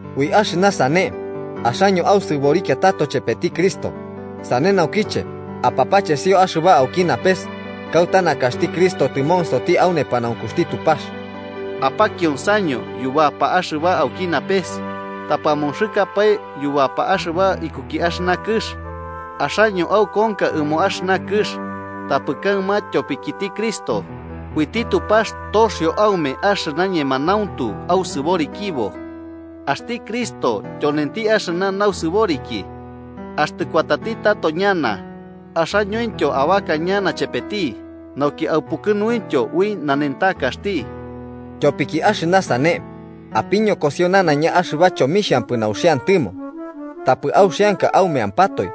Ui axɨna sane, axaño ausɨborikia tato chepeti Cristo, sane naukiche apapachesio axɨba auki napes, kauta nakaxti Cristo tɨmonsoti au nepanaunkuxti Tupax. Apakionsaño yubapa axɨba auki napes, tapɨ amonxɨkapae yubapa axɨba ikuki axɨna kɨx. Axaño aukonka ɨmo axɨna kɨx, tapɨ kaɨma tyopikiti Cristo, uiti Tupax toxio aume axɨna ñemanauntu ausɨborikibo. Axti Cristo tyonenti axɨna nausɨboriki. Axtɨ kuatati tato ñana, axañointyo abaka ñana chepeti nauki aupukɨnuintyo ui nanentakaxti. Tyopiki axɨna sane, apiñokosio nanaiña axɨba chomixhampɨ nauxiantɨmo. Tapɨ auxianka aumeampatoe,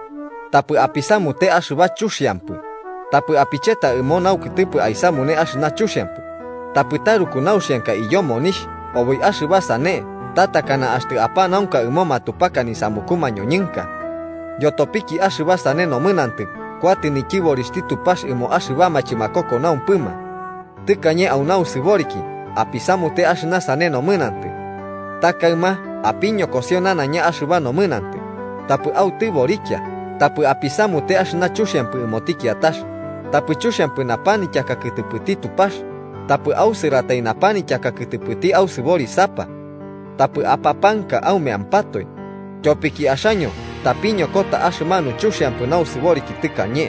tapɨ apisamute axɨba chuxiampɨ, tapɨ apicheta ɨmo naukɨtɨpɨ aisamune axɨna chuxiampɨ, tapɨ taruku nauxianka iyo monixh oboi axɨba sane ta takana axtɨ apanaunka ɨmo matupaka nisamuku mañoñɨnka. Yotopiki axɨba sane nomɨnantɨ kuatɨ nityɨborixhti Tupax ɨmo axɨbama chɨmakokonaumpɨma. Tɨkañe au nausɨboriki apisamute axɨna sane nomɨnantɨ. Ta kaɨma apiñokosio nanaiña axɨba nomɨnantɨ: tapɨ autɨborikia, tapɨ apisamute axɨna chuxiampɨ ɨmoti kiatax, tapɨ chuxiampɨ napanityaka kɨtɨpɨti Tupax, tapɨ ausɨratai napanityaka kɨtɨpɨti ausɨborisapa. Tapɨ apapanka aumeampatoe, tyopiki axaño tapiñokota axɨmanu chuxiampɨ nausɨboriki tɨkañe,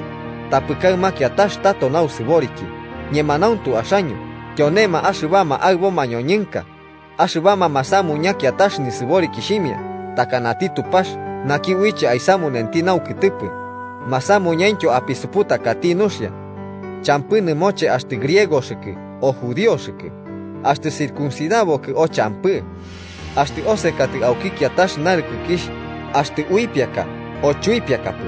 tapɨ kaɨma kiatax tato nausɨboriki ñemanauntu axaño tyonema axɨbama aɨbo mañoñɨnka, axɨbama masamuña kiatax nausɨboriki takanati Tupax naki uiche aisamunenti naukɨtɨpɨ, masamuñaintyo apisuputakati nuxia. Champɨ nɨmoche axtɨ griegokɨ o judioxɨkɨ, axtɨ circuncidabokɨ o champɨ, axtɨ osekatɨ auki kiatax narɨkɨkixh, axtɨ uipiaka o chuipiakapɨ,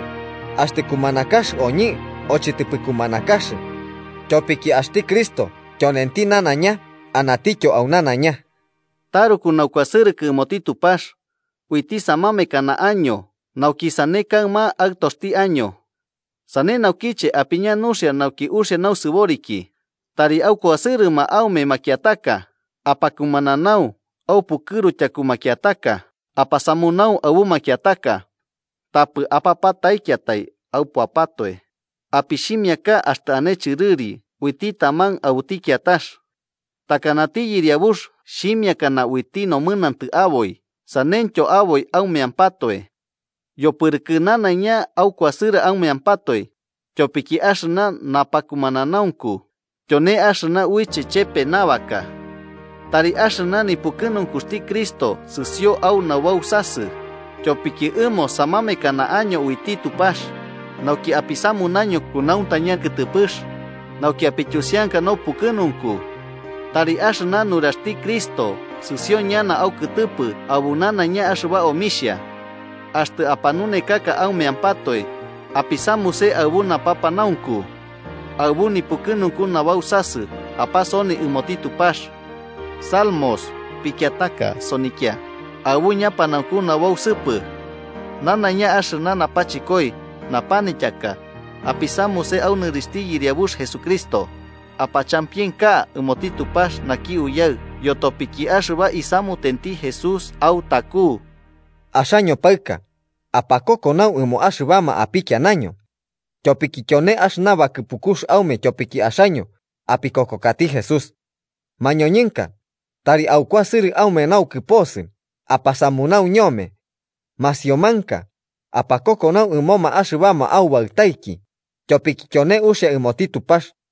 axtɨ kumanakax oñɨ o chɨtɨpɨ kumanakax, tyopiki axti Cristo tyonenti nanaiña anatityo au nanaiña. Taruku naukuasɨrɨkɨ ɨmoti Tupax, uiti samamekana año nauki sane kaɨma aɨtoxti año. Sane naukiche apiña nuxia nauki uxia nausɨboriki, tari akuasɨrɨma aume makiataka, apakumananau, aupukɨru tyaku makiataka, apasamunau aɨbu makiataka. Tapɨ apapataikiatai aupuapatoe, apixhimiaka axtɨ ane chɨrɨri uiti taman aɨbuti kiatax. Takanati Yɨriabux xhimiakana uiti nomɨnantɨ aboi, saneityo aboi aumeampatoe. Yopɨrɨkɨ nanaiña aukuasɨrɨ aumeampatoe, tyopiki axɨna napakumananaunku tyone axɨna uiche chepe nabaka. Tari axɨna nipukɨnunkuxti Cristo sɨsio au nabausasɨ, tyopiki ɨmo samamekana año uiti Tupax nauki apisamunaño kunauntaña kɨtɨpɨx, nauki apityusianka naupukɨnunku. Tari axɨna nuraxti Cristo sɨsio ñana aukɨtɨpɨ aɨbu nanaiña axɨba omixha. Axtɨ apanunekaka aumeampatoe, apisamuse aɨbu napapanaunku. Aɨbu nipukɨnunku nabausasɨ apasoni ɨmoti Tupax. Salmos, pikiataka sonikia aɨbu ñapanaunku nabausɨpɨ. Nanaiña axɨna napachɨkoi napanityaka, apisamuse au nɨrixhti Yɨriabux Jesucristo, apachampienka ɨmoti Tupax naki Uyaɨ yotopiki axɨba isamutenti Jesús autaku. Axaño paɨka, apakokonau ɨmoma axɨbama apikianaño. Tyopiki tyone axɨna bakɨpukux aume tyopiki axaño apikokokati Jesús. Mañoñɨnka, tari aukuasɨrɨ aume naukɨposɨ apasamunau ñome. Masiomanka, apakokonau ɨmoma axɨbama aubaɨtaiki, tyopiki tyone uxia ɨmoti Tupax.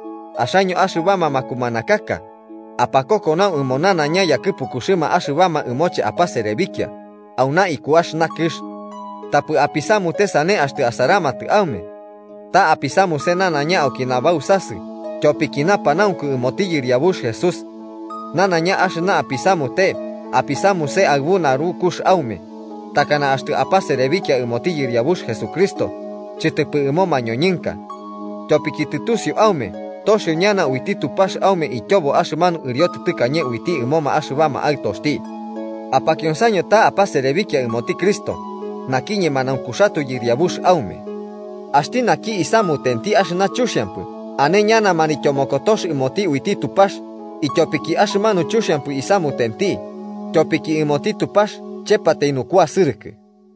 Axaño axɨbama makumanakaka, apakokonau ɨmo nanaiña yakɨpukuxɨma axɨbama ɨmoche apaserebikia auna iku axɨna kɨx. Tapɨ apisamute sane axtɨ asaramatɨ aume. Ta apisamuse nanaiña auki nabausasɨ tyopiki napanaunku ɨmoti Yɨriabux Jesús. Nanaiña axɨna apisamute apisamuse aɨbu narukux aume, takana axtɨ apaserebikia ɨmoti Yɨriabux Jesucristo chɨtɨpɨ ɨmo mañoñɨnka. Tyopiki tɨtusiu aume toxio ñana uiti Tupax aume ityobo axɨmanu ɨriotɨ tɨkañe uiti ɨmoma axɨbama aɨtoxti. Apakionsaño ta apaserebikia ɨmoti Cristo naki ñemanaunkuxatoe Yɨriabuxti aume. Axti naki isamutenti axɨna chuxiampɨ ane ñana manityomokotox ɨmoti uiti Tupax ityopiki axɨmanu chuxiampɨ isamutenti, tyopiki ɨmoti Tupax chepatai nukuasɨrɨkɨ.